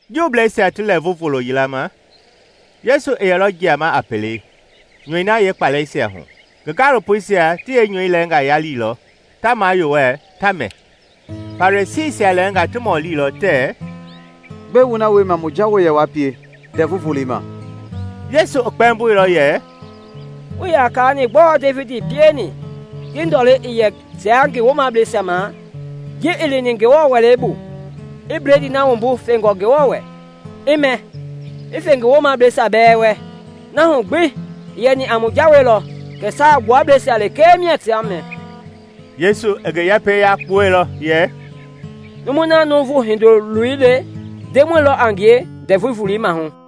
Juubleisia ti Lɛɛvu Volo yila ma Yesu i yɛlɔ jiama a pelei nyɔi na yeekpalɛisia hu. Ngi gaalopoisia ti yeenyɔi lɛɛnga yaliilɔ, ta mayowɛlɛ, ta mɛ. Farisiisia lɛɛnga ti mɔlilɔ tɛɛ, “Gbɛe wu na wiema mu Jawei yɛ wa pie Ndɛvu Volei ma?” Yesu i kpɛmboilɔ yɛ, “Wuii ya kaani gbɔɔ Devidi pieni ji ndɔlei i yɛ tia ngi woomableisia ma? Ji i lini Ngewɔ wɛlei bu, i bledii na wumbu fengɔ Ngewɔ wɛ, i mɛ, i fe ngi woomableisia bɛɛ wɛ. Na hu gbi i yɛni a mu jawei lɔ kɛ saagbuableisia lekee mia ta mɛ.” Yesu i ngi yɛpɛi yakpuɛilɔ yɛ, “Numu na Nuuvu Hindoloi le, Ndemɔi lɔ a ngie Ndɛvu Volei mahu.”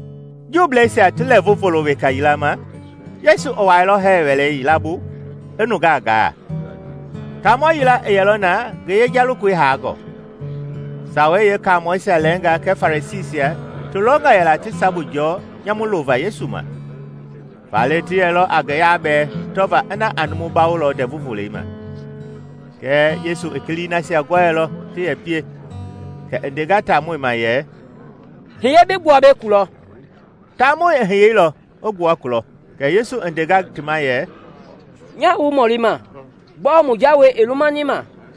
Juubleisia ti Lɛɛvu Volo weka yila ma Yesu i wuailɔ hɛɛ wɛlɛ yila bu i nungaa gaa. Taamɔ yila i yɛlɔ na ngi yeja lokoi hangɔ. Sawei Yeekamɔɛisia lɛɛnga kɛɛ Farisiisia ti longɔ yɛla ti sabu jɔɔ nyamu lova Yesu ma. Faale ti yɛlɔ a ngi yabɛɛ tɔvaa ina a numu bawolɔ Ndɛvu Volei ma. Kɛɛ Yesu i kilii nasia gɔɛilɔ ti yɛ pie, kɛ i ndenga taamɔi ma yɛ, “Hiye bi gbua mbei kulɔ.” Taamɔi i hiyeilɔ i gbua kulɔ. Kɛ Yesu i ndenga ti ma yɛ, “Nya wu mɔlima: Gbɔɔ mu jawei i lumani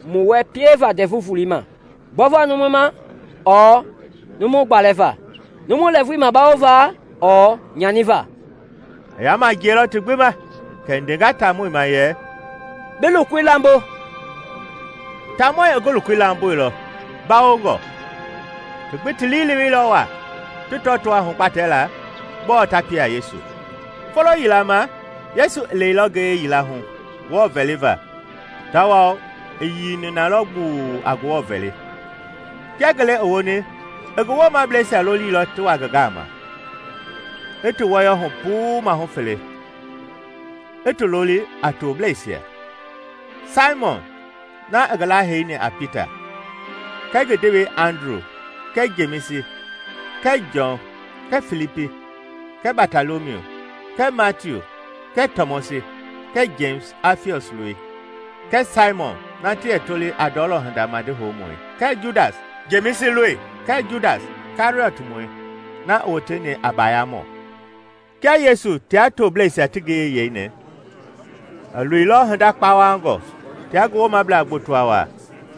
mu wɛ pieva Ndɛvu Volei ma? Gbɔva numu ma ɔɔ numu gbalɛva? Numu lɛɛvui bawova ɔɔ nyaniva?” I yama jiɛilɔ ti gbi ma; kɛ i ndenga taamɔi ma yɛ, “Bi lokoi lambo.” Taamɔi i ngi lokoi lamboilɔ, mbawongɔ. Ti gbi ti lii i leweilɔ wa, ti tɔtoo a hugbatɛla gbɔɔ ta pie a Yesu. Folo yila ma Yesu i lɛilɔ ngiye yila hu Ngewɔ vɛliva tawao i yiini na lɔ gbuu a Ngewɔ vɛli. Kia ngele i woni, i ngi woomableisia lolilɔ ti wa ngi gama, i ti wɔyɔ hu puu mahu fele, i ti loli a tobleisia. Saimɔn (na i ngi laheini a Pita) kɛɛ ngi ndewei Andru kɛɛ Jemisi kɛɛ Jɔn kɛɛ Filipi kɛɛ Batɔlɔmiu kɛɛ Matiu kɛɛ Tɔmɔsi kɛɛ Jemisi, Afiɔs loi, kɛɛ Saimɔn na ti yɛ toli a ndɔlɔ hinda madi houmɔi kɛɛ Judas, Jemisi loi, kɛɛ Judas Kɛriɔtmɔi na i woteni a bayamɔ. Kia Yesu tia tobleisia ti ngiyei yeini, i loilɔ hinda kpawangɔ tia ngi woomabla gboto wa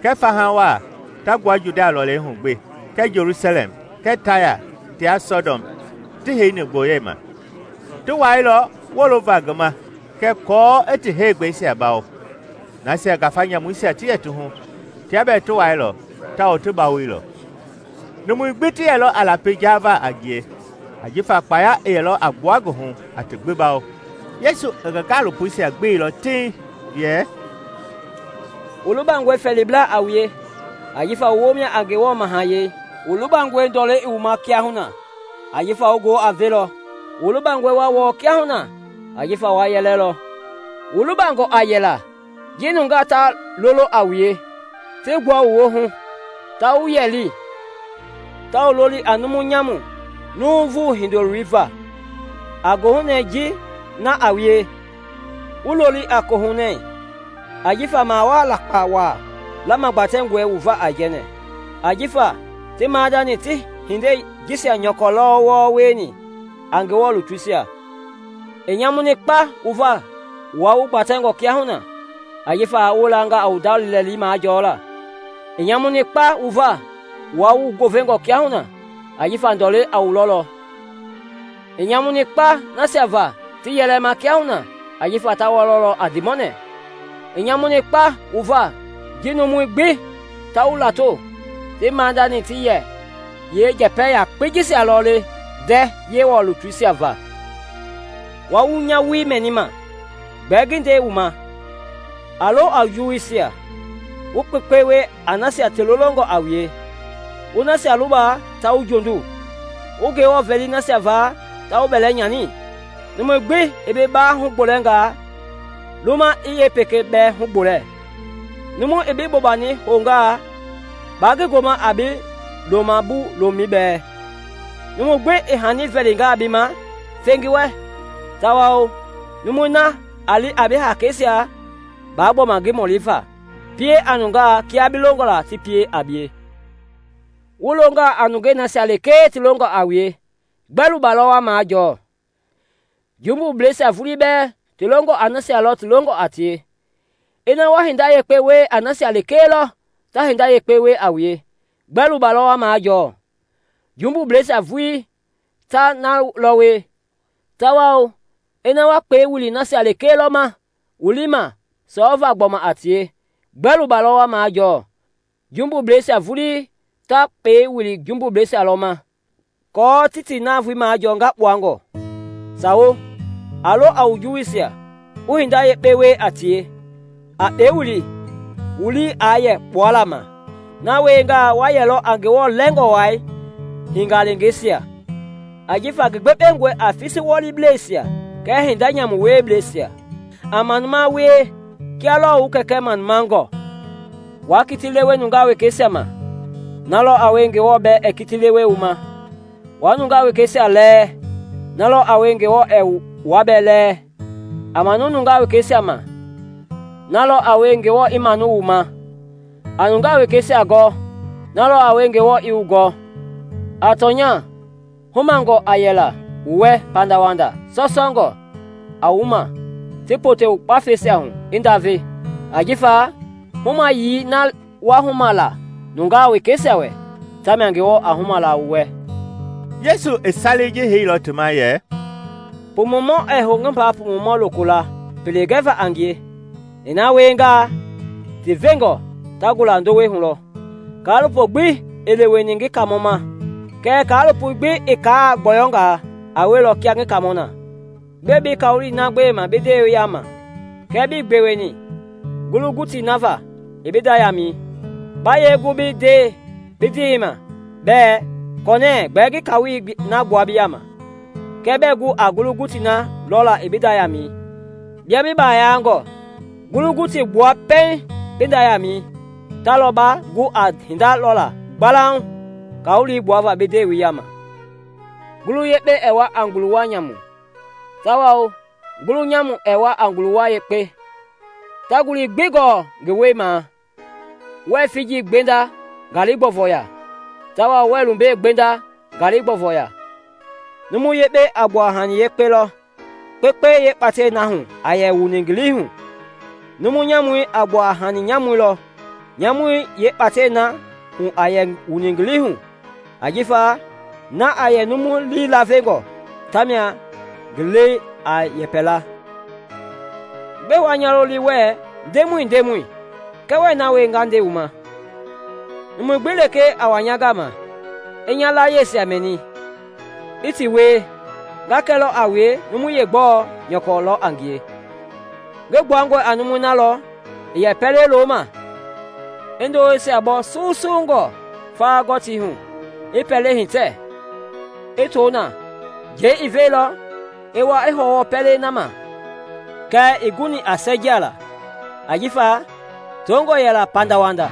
kɛɛ faha wa ta gbua Judia lɔlei hu gbi kɛɛ Jelusalɛm kɛɛ Taya tia Saidɔn ti heini gboyeima; ti wailɔ wolova ngi ma kɛɛ aako i ti heegbɛisia bawo. Nasia ngafa nyamuisia ti yɛ ti hu, tia bɛɛ ti wailɔ tawao ti bawoilɔ. Numui gbi ti yɛlɔ a lapi jaava a ngie, ajifa kpaya i yɛlɔ a gbua ngi hu a ti gbi bawo. Yesu i ngi gaalopoisia gbeilɔ tiŋ yɛ, “Wu lubangɔe fɛɛlibla a wue; ajifa wu woo mia a Ngewɔ mahayɛi! Wu lubangɔe ndɔlɛ i wu ma kiahuna; ajifa wu goo a velɔ! Wu lubangɔe wa wɔɔ kiahuna; ajifa wa yɛlɛlɔ! “Wu lubangɔ a yɛla ji nungaa ta lolo a wue, ti gbua wu woohu, ta wuyɛli, ta wu loli a numu nyamu Nuuvu Hindoloi va. A gohunɛ ji na a wie, wu looli a kohunɛ ajifa mawaa lakpa wa lamagbatɛngɔe wu va aijɛnɛ. Ajifa ti maadani ti hindei jisia nyɔkɔ lɔ wieni wɔɔ a Ngewɔ lutuisia. Kɛɛ i nyamuni kpa wu va, wua wu gbatɛngɔ kiahuna; ajifa wu wilanga a wu nda liilɛli majɔla! I nyamuni kpa wu va, wua wu goovengɔ kiahuna; ajifa ndɔleiɛi a wu lɔlɔ! I nyamuni kpa nasia va ti yɛlɛma kiahuna; ajifa ta wɔlɔ a ndiimɔnɛ! “I nyamuni kpa wu va ji numui gbi ta wu lato; ti maadani ti yɛ yeenjɛpɛ yakpei jisia lɔ le ndɛɛ Yewɔ lutuisia va. “Wua wu nya woi mɛnima, gbɛɛ ngi nde wu ma: A lo a wu juwuisia, wu kpekpe wie a nasia ti lolongɔ a wue, wu nasia luba ta wu jondu, wu Ngewɔ vɛli nasia va ta wu bɛlɛ nyani. Numu gbi i bi bawɛi yeengila hugbolɛnga, luma i yeepekei bɛɛ hugbolɛ; numu i bi bobani houngaa, ba ngi goma a bi loma bu lomɛi bɛɛ. Numu gbi i hani vɛlinga bi ma, fe ngi wɛ; tawao numui na a li a bi hakeisia, ba gbɔma ngi mɔli fa. Pie a nungaa kia bi longɔ ti pie a bie. “Wu longaa a nungei nasia lekee ti longɔ a wue, gbɛ luba lɔ wa majɔɔ? Jumbubleisia vulii bɛɛ ti longɔ a nasia lɔ ti longɔ a tie! Ina wa hinda yekpe wie a nasia lekee lɔ ta hinda yekpe wie a wue, gbɛ luba lɔ wa majɔɔ? Jumbubleisia vulii ta na lɔ wie! Tawao ina wa kpɛi wili nasia lekee lɔ ma wu lii i ma sɔɔvaa gbɔma a tie, gbɛ luba lɔ wa majɔɔ? Jumbubleisia vulii ta kpɛi wili jumbubleisia lɔ ma, aako ti ti navoei majɔɔ ngakpuangɔ! Sawo! A lo a wu juwuisia, wu hinda yekpe wie a tie; a kpɛi wili, wu lii aa yɛ kpuala ma. Na wiengaa, wa yɛlɔ a Ngewɔ Lɛngɔ Wai hingaleengeisia. Ajifa ngi gbekpengɔi a fisiwɔliblɛisia kɛɛ hinda nyamu wieblɛisia. A manuma wie kia lɔɔ wu Kɛɛ manumangɔ. “Waa kiti lewe nungaa wekeisia ma, na lɔ a wie Ngewɔ bɛɛ ɛɛ kiti lewe wu ma; wa nungaa wekeisia lɛɛ, na lɔ a wie Ngewɔ ɛɛ wua bɛɛ lɛɛ; a manu nungaa wekeisia ma, na lɔ a wie Ngewɔ i maanu wu ma. A nungaa wekeisia gɔ, na lɔ a wie Ngewɔ i wu gɔ. A tɔnya, humangɔ a yɛla wu wɛ pandawanda, sɔsɔngɔ, a wu ma, ti pote wu kpafɛi hu i ndave. Ajifa humayii na wa huma la nungaa wekeisia wɛ, tamia Ngewɔ a huma la wu wɛ.” Yesu i salei ji heilɔ ti ma yɛ, “Pumumɔ ɛɛ hou ngi mba pumumɔ lokola pele gɛva a ngie; i na wiengaa, ti veenjɔ ta gulalɔ ndowei hu. Kaalopo gbi ii leweni ngi Kaamɔ ma; kɛɛ kaalopo gbi i kaai gbɔyɔnga, a wielɔ kia ngi Kaamɔ na. “Gbɛe bi kawolei na gbema i bi ndewei yama kɛɛ bi gbewe gbi ii ngulu-gutii na ma i bi nda yamɛi? Baa yee gu bi nde bi ndewei ma bɛɛ ‘Kɔnɛɛ, gbɛɛ ngi kawolei na gbua bi yama,’ kɛɛ bɛɛ gu a ngulu-gutii na lɔla i bi nda yamɛi? Bia bi bayangɔ! Ngulu-gutii gbua pɛiŋ bi nda yamɛi, ta lɔ ba gu a hinda lɔla gbalauŋ kawolei gbuava bi ndewei yama. “Ngulu yekpe ɛɛ wua a nguluwa nyamu, tawao ngulu nyamu ɛɛ wua a nguluwa yekpe. Ta ngulii gbi gɔɔ ngi wɛi ma lɔ; wɛɛ figi gbenda ngali gbɔvoi ya tawao wɛɛ lumbe gbenda ngali gbɔvoi ya. Numu yekpei a gbua a hani yekpe lɔ kpekpei yeekpatɛi na hu a yɛ wuni ngi lii hu; numu nyamui a gbua a hani nyamui lɔ nyamui yeekpatɛi na hu a yɛ wuni ngi lii hu. Ajifa na a yɛ numu lii lavengɔ, ta mia ngi lɛi a yɛpɛla. “Gbɛe wa nya loli wɛɛ ‘Ndemɔi, Ndemɔi,’ kɛɛ wɛɛ na wie nga nde wu ma? Numu gbi lekee a wa nya gama, i nya layiesia mɛni, i ti wie, nga kɛlɔ a wue numui yeegbɛ nyɔkɔ lɔ a ngie. Ngi gbuangɔ a numui na lɔ i yɛ pɛlei loma, i ndoweisia bɔ susungɔ fawa-gɔtii hu, i pɛlei hitɛ, i to na; njɛi i veilɔ, i wa i hɔwɔ pɛlei na ma kɛɛ ii guni a sɛɛjiala, ajifa tongɔ yɛla pandawanda.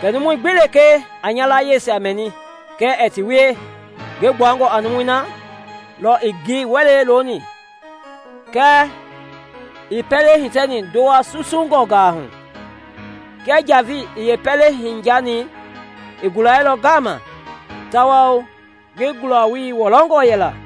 Kɛɛ numui gbi lekee a nya layiesia mɛni kɛɛ ɛɛ ti wie, ngi gbuangɔ a numui na lɔ i ngi wɛlei looni kɛɛ ii yeepɛlei hitɛni ndowa susungɔnga hu; kia njavei i yeepɛlei hiyani, i gulailɔ ngama tawao ngi gulawoi wɔlɔngɔ yɛla!”